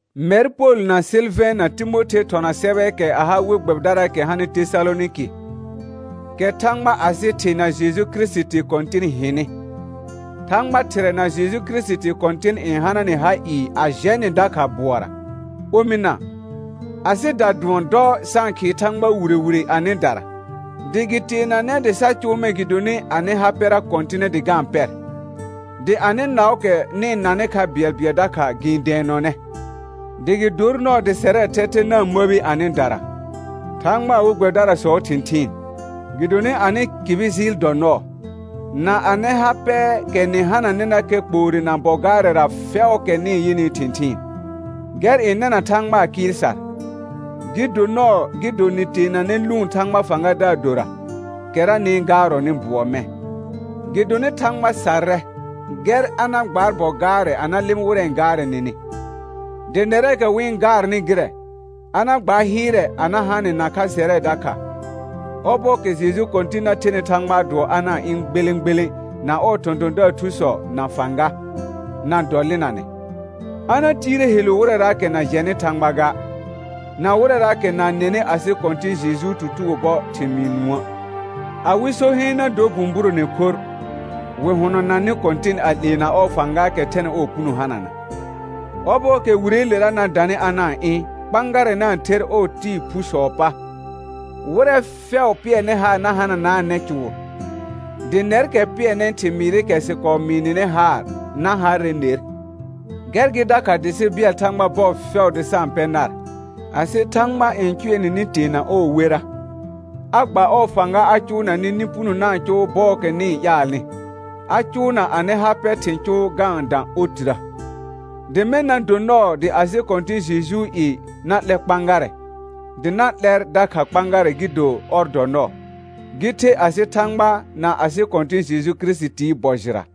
Mɛr Pol na Sɩlvɛ̃ na Timothe thɔna sɛbɛɛkɛ a ha we gbɛbɩdaraakɛ hanɩ Tesalonɩkɩ, kɛ Thãgba asɩ Thɩ na Jeju Kirisiti Kɔ̃tɩn hɩnɩ. Thãgba Thɩrɛ na Jeju Kirisiti Kɔ̃tɩn n hana nɩ ha ɩɩ a jɛ nɩ dakha bʋɔra. Omɩna, asɩda dʋɔn dɔ sa-n khɩɩ Thãgba wire wire anɩdara, dɩ gɩ teenanɛ dɩ sa cʋʋ mɛ̃ gɩdonɩ anɩ ha pɛra kɔ̃tɩnɛ dɩ ga-n pɛr, dɩ anɩ naʋʋkɛ nɩ-n nanɩ kha bɩɛlbɩɛl dakha gɩ-n dɛɛnɔnɛ. Dɩ gɩ dor nɔɔ dɩ sɛrɛɛ thɛthɛ na-n məbi anɩdara, Thãgbaa we gbɛbɩdarasɔɔ thɩ̃thɩɩn, gɩdonɩ anɩ kɩbɩ jɩɩl dɔ nɔɔ, na anɩ ha pɛɛkɛ nɩ hananɩnakɛ kpoore na bɔ gaarɛra fɛʋʋkɛ nɩ-n yɩnɩɩ thɩ̃thɩɩn. Gɛr n nɛna Thãgbaa kɩɩl sar, gɩ do nɔɔ gɩ do nɩ teenanɛ lʋʋn Thãgbaa fãgadaar dora, kɛra nɩ-n gaarɔnɩ bʋɔ mɛ̃. Gɩdonɩ Thãgba sarrɛ gɛr a na gbaar bɔ gaarɛ ana lɩmɩ wɩrɛ n gaarɛ nɩnɩ, dɩ nɛrɛɛkɛ wɩ-n gaarnɩ gɩrɛ, a na gbaar hɩɩrɛ a na ha nɩ nakha sɛrɛ dakha, ɔbɔɔkɛ Jeju Kɔ̃tɩn na thenɩ Thãgbaa dʋɔ a na-n ɩ̃ gbelẽ gbelẽ na ɔɔ thɔ̃thɔ̃daar thusɔ na fãga, na dɔlɩnanɛ. A na tiire helu wɩrɛraakɛ na jɛnɩ Thãgba ga, na wɩrɛraakɛ na-n nɛnɩ asɩ Kɔ̃tɩ̃ Jejuu tutugo bɔ thɩmɩɩ nũə'. Awɩ so heen na dor bũburone khorr, wɩ hʋnɔnanɩ Kɔ̃tɩn a 'leena ɔɔ fãgaakɛ thɛnɩ ɔɔ puno hanana. Ɔbɔɔkɛ Wireelera na danɩ a na-n ɩ̃ kpãgarɛ na-n ther ɔɔ tɩɩ phusɔɔ pa, wɩrɛ fɛʋ pɩɛrnɩ haar na hananaanɛ cʋʋr, dɩ nɛrkɛ pɩɛrnɩ thɩmɩɩrɩkɛ sɩ kɔɔ mɩɩ nɩnɩ haar na harrɛ ner. Gɛr gɩ dakha dɩ sɩ bɩɛl Thãgba bɔɔ fɛʋ dɩ sa-n pɛ nar, asɩ Thãgba n cʋɛ nɩ nɩ teena ɔɔ wera, a gba ɔɔ fãga a cʋʋna nɩ nɩ puno na-n cʋʋ bɔɔkɛ nɩ-n ƴaalnɩ, a cʋʋna anɩ ha pɛ thɩ̃ cʋʋ ga-n dã otirə. Dɩ mɛ̃ na do nɔɔ dɩ asɩ Kɔ̃tɩ̃ Jejuu i na 'lɛ kpãgarɛ, dɩ na 'lɛr dakha kpãgarɛ gɩ do ɔr dɔ nɔɔ, gɩ the asɩ Thãgba na asɩ Kɔ̃tɩ̃ Jeju Kirisitii bɔ jɩra.